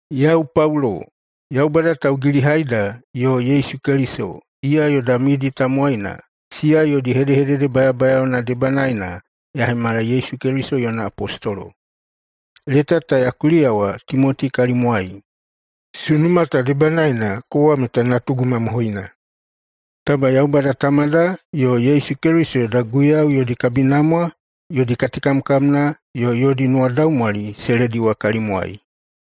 Yau Paulo. Yaubada taugilihaida yo Yesu Keliso, iya yoda midi tamowaina, siya yodi hedehedede bayabayaona debanaena ya hemala Yesu Keliso yona apostolo. Leta ta ya kuliyawa Timoti kalimwai. Sunuma ta debanaena kowa meta natugu mamohoina. Taba Yaubada Tamada yo Yesu Keliso yoda Guiyau yodi kabinamwa, yodi katekamkamna yo yodi nuwadaumwali se lediwa kalimwai.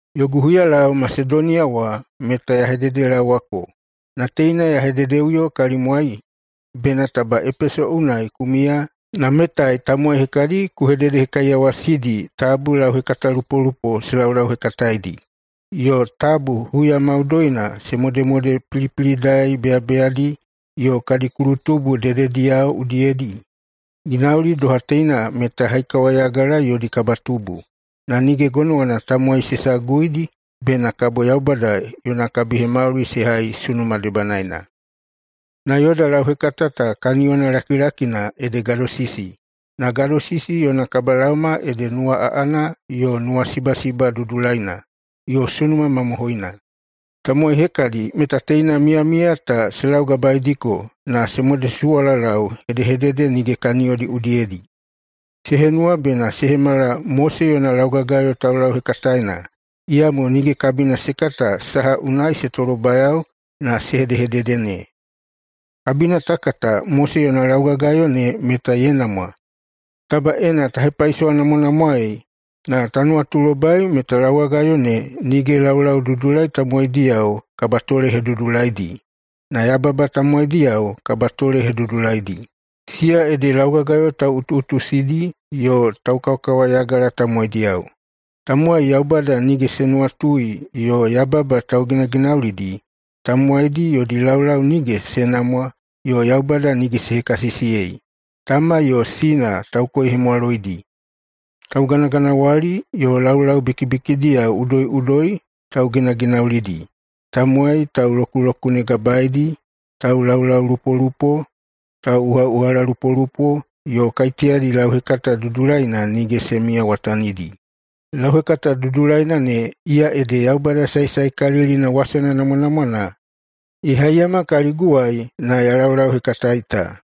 Yogu huyalau Masedoniya wa meta ya hededelaowako, na teina ya hededeꞌuyo kalimwai bena taba Epeso unai ku miya na metai tamowai hekadi ku hededehekaiyawasidi tabu lauhekatalupolupo se laulauhekataedi yo tabu huya maudoina se modemode pilipilidai beyabeyadi yo kadi kulutubu dedediyao udiyedi. Ginauli doha teina meta haikawayagala yodi kabatubu, na nige gonowana tamowai se saguidi bena kabo Yaubada yona kabihemauli se hai sunuma debanaena. Na yoda lauhekata ta kaniyona lakilakina ede gadosisi, na gadosisi yona kabalaoma ede nuwa aꞌana yo nuwasibasiba dudulaina yo sunuma mamohoina. Tamowai hekadi meta teina miyamiya ta se laugabaediko na se modesuwalalau hedehedede nige kaniyodi udiyedi. Se henuwa bena se hemala Mose yona laugagayo taulauhekataena, iyamo nige kabina se kata saha unai se tolobayao na se hedehedede ne. Kabina ta kata Mose yona laugagayo ne meta ye namwa, taba ena ta hepaisowanamwanamwaei na ta nuwatulobai meta laugagayo ne nige laulaududulai tamowaidiyao kabatolehedudulaidi, na yababa tamowaidiyao kabatolehedudulaidi. Siya ede laugagayo tauꞌutuꞌutusidi yo taukawakawayagala tamowaidiyao, tamowai Yaubada nige se nuwatui yo yababa tauginaginaulidi, tamowai yodi laulau nige se namwa yo Yaubada nige se hekasisiyei, tama yo sina taukoihemwaloidi, taukaikaiunu, tauganaganawali yo laulau bikibikidiyao udoiꞌudoi tauginaginaulidi, tamowai taulokulokunegabaedi, taulaulaulupolupo, tauꞌuhaꞌuhalalupolupo, yo kaiteyadi lauhekata dudulaina nige se miyamiyawatanidi. Lauhekata dudulaina ne, iya ede Yaubada saesaekalilina wasana namwanamwana, ye haiyama kaliguwai na ya laulauhekataei ta.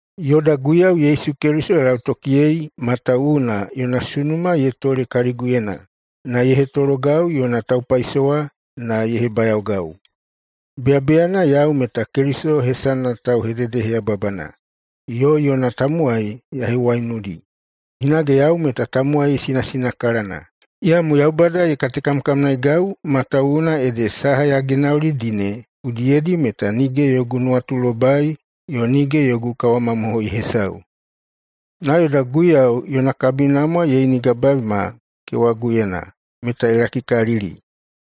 Yoda Guiyau Yesu Keliso ya lautokiyei matawuwuna yona sunuma ye tole kaliguyena na ye hetologau yona taupaisowa na ye hebayaogau. Beyabeyana yau meta Keliso hesana tauhededeheyababana yo yona tamowai ya hewaiunudi, hinage yau meta tamowai sinasinakalana. Iyamo Yaubada ye katekamkamnaeigau matawuwuna ede saha ya ginaulidi ne udiyedi meta nige yogu nuwatulobai yo nige yogu kawamamohoi hesau. Na yoda Guiyau yona kabinamwa ye inigabaeiyama kewaguyena meta ye lakikalili,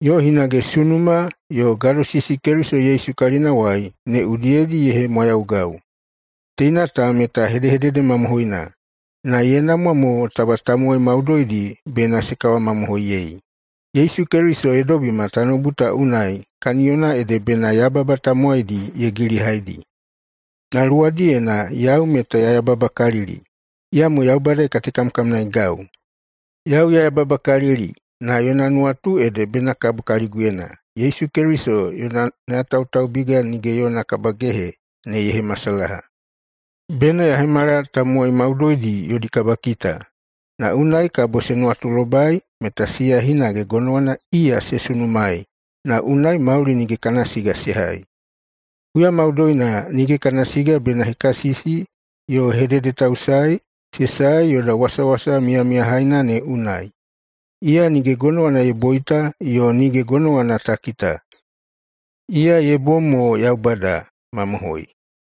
yo hinage sunuma yo gadosisi Keliso Yesu kalinawai ne udiyedi ye hemwayaugau. Teina ta meta hedehedede mamohoina, na ye namwa mo taba tamowai maudoidi bena se kawamamohoiyei: Yesu Keliso ye dobima tanoubu ta unai kaniyona ede bena yababa tamowaidi ye gilihaidi. Na luwadiyena yau meta ya yababakalili. Iyamo Yaubada ye katekamkamnaeigau. Yau ya yababakalili, na yona nuwatu ede bena kabo kaliguyena Yesu Keliso yona nayatautaubiga nige yona kabagehe ne ye hemasalaha. Bena ya hemala tamowai maudoidi yodi kabakita, na unai kabo se nuwatulobai meta siya hinage gonowana iya se sunumaei na unai mauli nige kana siga se hai. Huya maudoina nige kana siga bena hekasisi yo hededetausaei se sae yoda wasawasa miyamiyahaina ne unai. Iya nige gonowana ye boita yo nige gonowana ta kita, iya ye bom mo Yaubada. Mamohoi.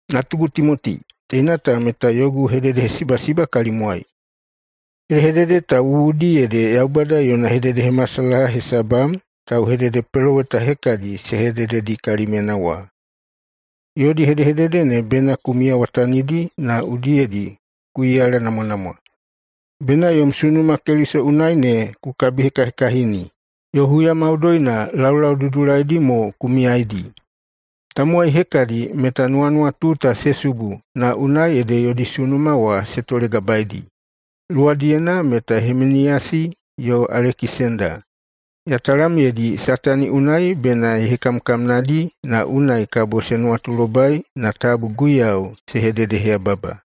Natugu Timoti, teina ta meta yogu hededehesibasiba kalimwai. Hedehedede ta wuwudi ede Yaubada yona hededehemasalaha hesabam tauhededepeloweta hekadi se hedededi kalimyena wa. Yodi hedehedede ne bena ku miyawatanidi na udiyedi ku iyalanamwanamwa. Bena yom sunuma Keliso unai ne ku kabihekahekahini, yo huya maudoina laulau dudulaidi mo ku miyaidi. Tamowai hekadi meta nuwanuwatu ta se subu na unai ede yodi sunuma wa se tolegabaedi. Luwadiyena meta Himiniyasi yo Alekisenda. Ya talamyeidi Satani unai bena ye hekamkamnadi na unai kabo se nuwatulobai na tabu Guiyau se hededeheyababa.